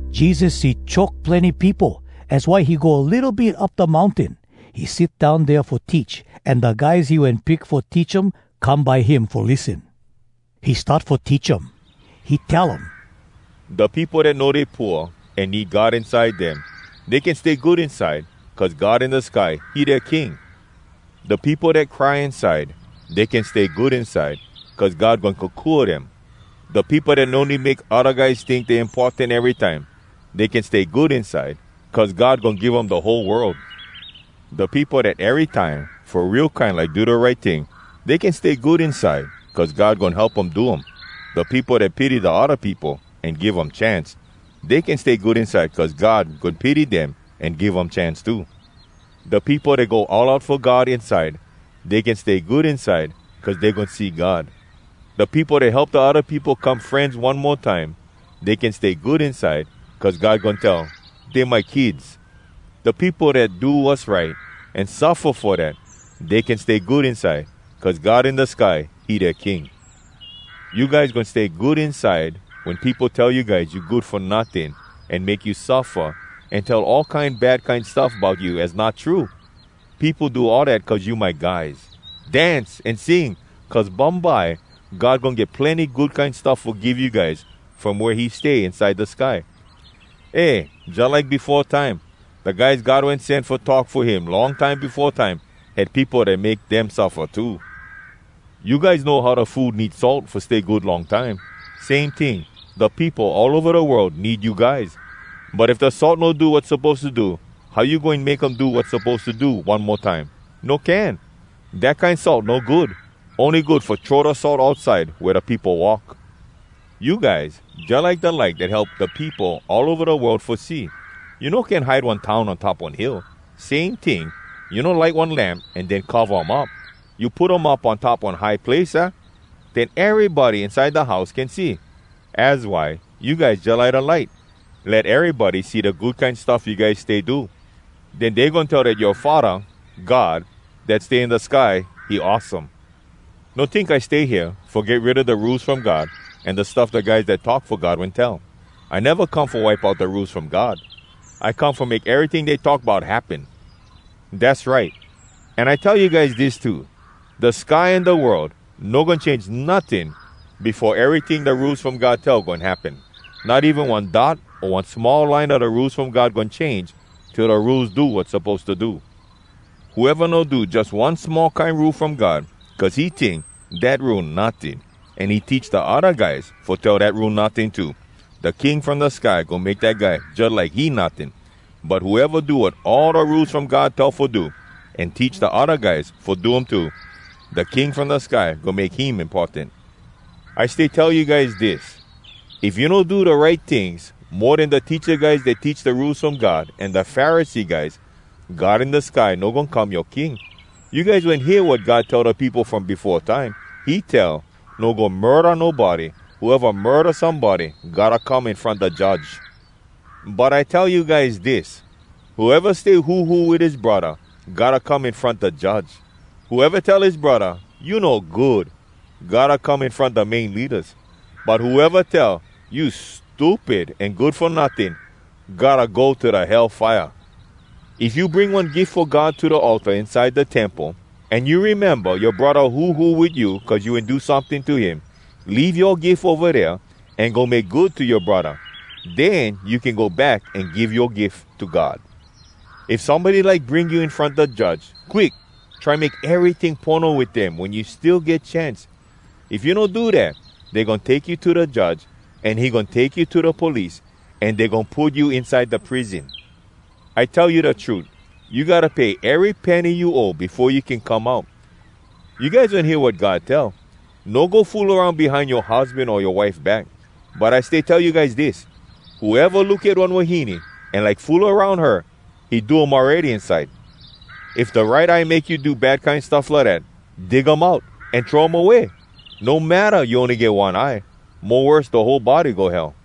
Jesus see choke plenny peopo, az why he go litto bit up da mountain. He sit down dea fo teach, an da guys he wen pick fo teach um come by him fo lissen. He start fo teach um. He tell um: “Da peopo dat know dey pooa an need God inside dem, Dey can stay good inside Cuz God in da sky, he dea King. “Da peopo dat cry inside, Dey can stay good inside Cuz God goin kokua dem. “Da peopo dat no need make odda guys tink dey importan erytime, Dey can stay good inside Cuz God goin give um da whole world. “Da peopo dat erytime fo real kine like do da right ting, Dey can stay good inside Cuz God goin help um do um. “Da peopo dat pity da odda peopo, an give um chance, Dey can stay good inside Cuz God goin pity dem an give um chance too. “Da peopo dat go all out fo God inside, Dey can stay good inside Cuz dey goin see God. “Da peopo dat help da odda peopo come frenz one mo time, Dey can stay good inside Cuz God goin tell, ‘Dey my kids.’ “Da peopo dat do wass right, An suffa fo dat, Dey can stay good inside Cuz God in da sky, he dea King. “You guys goin stay good inside wen peopo tell you guys you good fo notting, an make you suffa, an tell all kine bad kine stuff bout you az not true. Peopo do all dat cuz you my guys. Dance an sing, cuz bumbye God goin get plenny good kine stuff fo give you guys from wea he stay inside da sky. Eh, jalike befo time, da guys God wen sen fo talk fo him long time befo time, had peopo dat make dem suffa too.” “You guys know how da food need salt fo stay good long time. Same ting, da peopo all ova da world need you guys. But if da salt no do wat suppose to do, how you goin make um do wat suppose to do one mo time? No can! Dat kine salt no good. Ony good fo throw da salt outside wea da peopo walk. “You guys jalike da light dat help da peopo all ova da world fo see. You no can hide one town on top one hill. Same ting, you no light one lamp an den cova um up. You put um up on top one high place, aah? Den erybody inside da house can see. Az why, you guys jalike da light. Let erybody see da good kine stuff you guys stay do. Den dey goin tell dat yoa Faddah, God, dat stay in da sky, he awesome! “No tink I stay hea fo get rid a da Rules From God an da stuff da guys dat talk fo God wen tell. I neva come fo wipe out da Rules From God. I come fo make eryting dey talk bout happen. Dass right! An I tell you guys dis too: Da sky an da world no goin change notting befo eryting da Rules From God tell goin happen. Not even one dot o one small line a da Rules From God goin change till da Rules do wat suppose to do. Whoeva no do jus one small kine Rule from God, cuz he tink, ‘Dat Rule notting,’ an he teach da odda guys fo tell dat Rule notting too, da King from da sky goin make dat guy jalike he notting. But whoeva do wat all da Rules From God tell fo do, an teach da odda guys fo do um too, da King from da sky goin make him importan. I stay tell you guys dis: If you no do da right tings, mo den da teacha guys dat teach da Rules From God an da Pharisee guys, God in da sky no goin come yoa King. “You guys wen hear wat God tell da peopo from befo time. He tell, ‘No go murda nobody. Whoeva murda somebody gotta come in front da judge.’ But I tell you guys dis: Whoeva stay huhu wit his braddah gotta come in front da judge. Whoeva tell his braddah, ‘You no good!’ gotta come in front da main leadas. But whoeva tell, ‘You stupid an good fo notting!’ gotta go to da Hell fire. “If you bring one gif fo God to da altar inside da temple, an you rememba yoa braddah huhu wit you cuz you wen do someting to him, leave yoa gif ova dea, an go make good to yoa braddah. Den you can go back an give yoa gif to God. “If somebody like bring you in front da judge, quick, try make eryting pono wit dem wen you still get chance. If you no do dat, dey goin take you to da judge, an he goin take you to da police, an dey goin put you inside da prison. I tell you da trut, you gotta pay ery penny you owe befo you can come out. “You guys wen hear wat God tell: ‘No go fool aroun behind yoa husban o yoa wife back.’ But I stay tell you guys dis: Whoeva look at one wahine an like fool aroun her, he do um awready inside. If da right eye make you do bad kine stuff lidat, dig um out, an throw um away! No matta you ony get one eye—mo worse da whole body go Hell!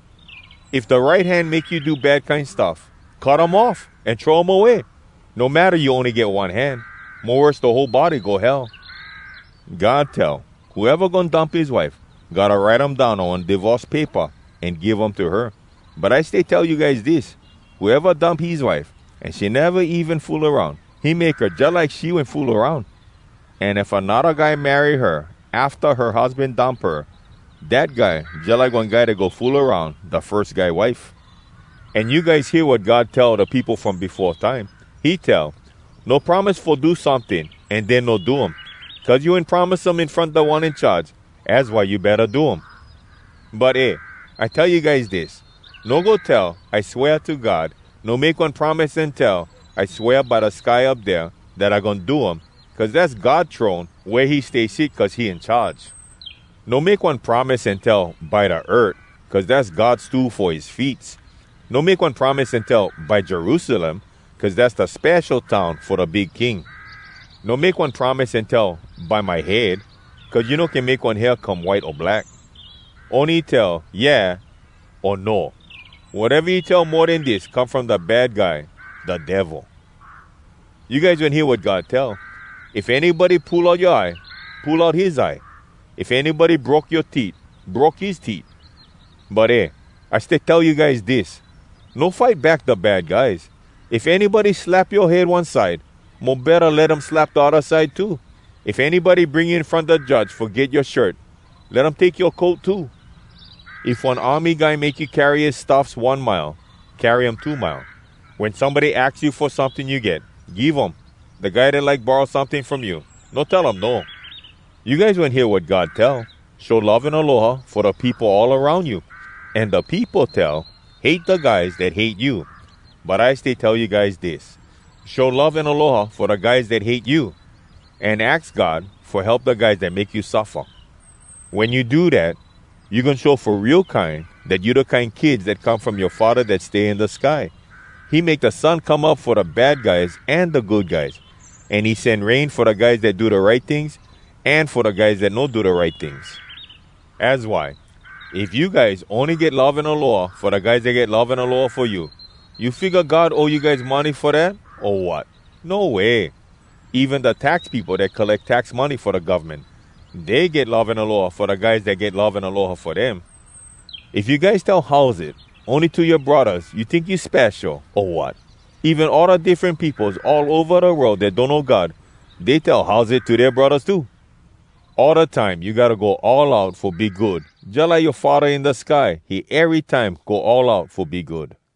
If da right hand make you do bad kine stuff, cut um off an throw um away! No matta you ony get one hand—mo worse da whole body go Hell! “God tell: ‘Whoeva goin dump his wife, gotta write um down on one divorce paypa an give um to her.’ But I stay tell you guys dis: Whoeva dump his wife, an she neva even fool aroun, he make her jalike she wen fool aroun. An if anodda guy marry her afta her husban dump her, dat guy jalike one guy dat go fool aroun da firs guy wife. “An you guys hear wat God tell da peopo from befo time. He tell, ‘No promise fo do someting an den no do um. Cuz you wen promise um in front Da One In Charge. Az why you betta do um!’ But eh! I tell you guys dis: No go tell, ‘I swea to God.’ No make one promise an tell ‘I swea by da sky up dea, dat I goin do um!’ cuz dass God throne, wea he stay sit cuz he in charge. No make one promise an tell ‘by da earth,’ cuz dass God stool fo his feets. No make one promise an tell ‘by Jerusalem,’ cuz dass da spesho town fo da big King. No make one promise an tell ‘by my head,’ cuz you no can make one hair come white o black. Ony tell, ‘Yeah’ o ‘No.’ Wateva you tell mo den dis come from da Bad Guy, da Devil. “You guys wen hear wat God tell: ‘If anybody pull out yoa eye, pull out his eye. If anybody broke yoa teet, broke his teet.’ But eh! I stay tell you guys dis: No fight back da bad guys. If anybody slap yoa head one side, mo betta let um slap da odda side too. If anybody bring you in front da judge fo get yoa shirt, let um take yoa coat too. If one army guy make you carry his stuffs one mile, carry um two mile. Wen somebody aks you fo someting you get, give um. Da guy dat like borrow someting from you, no tell um, ‘No!’ “You guys wen hear wat God tell: ‘Show love an aloha fo da peopo all aroun you.’ An da peopo tell: ‘Hate da guys dat hate you.’ But I stay tell you guys dis: Show love an aloha fo da guys dat hate you! An aks God fo help da guys dat make you suffa! Wen you do dat, you goin show fo real kine dat you da kine kids dat come from yoa Faddah dat stay in da sky. He make da sun come up fo da bad guys an da good guys. An he sen rain fo da guys dat do da right tings, an fo da guys dat no do da right tings. Az why, if you guys ony get love an aloha fo da guys dat get love an aloha fo you, you figga God owe you guys money fo dat, o wat?! No way! Even da tax peopo dat colleck tax money fo da govmen, dey get love an aloha fo da guys dat get love an aloha fo dem. If you guys tell ‘Howzit’ ony to yoa braddahs, you tink you spesho, o wat? Even all da diffren peopos all ova da world dat donno God, dey tell ‘Howzit’ to dea braddahs too. All da time you gotta go all out fo be good, jalike yoa Faddah in da sky, he erytime go all out fo be good.”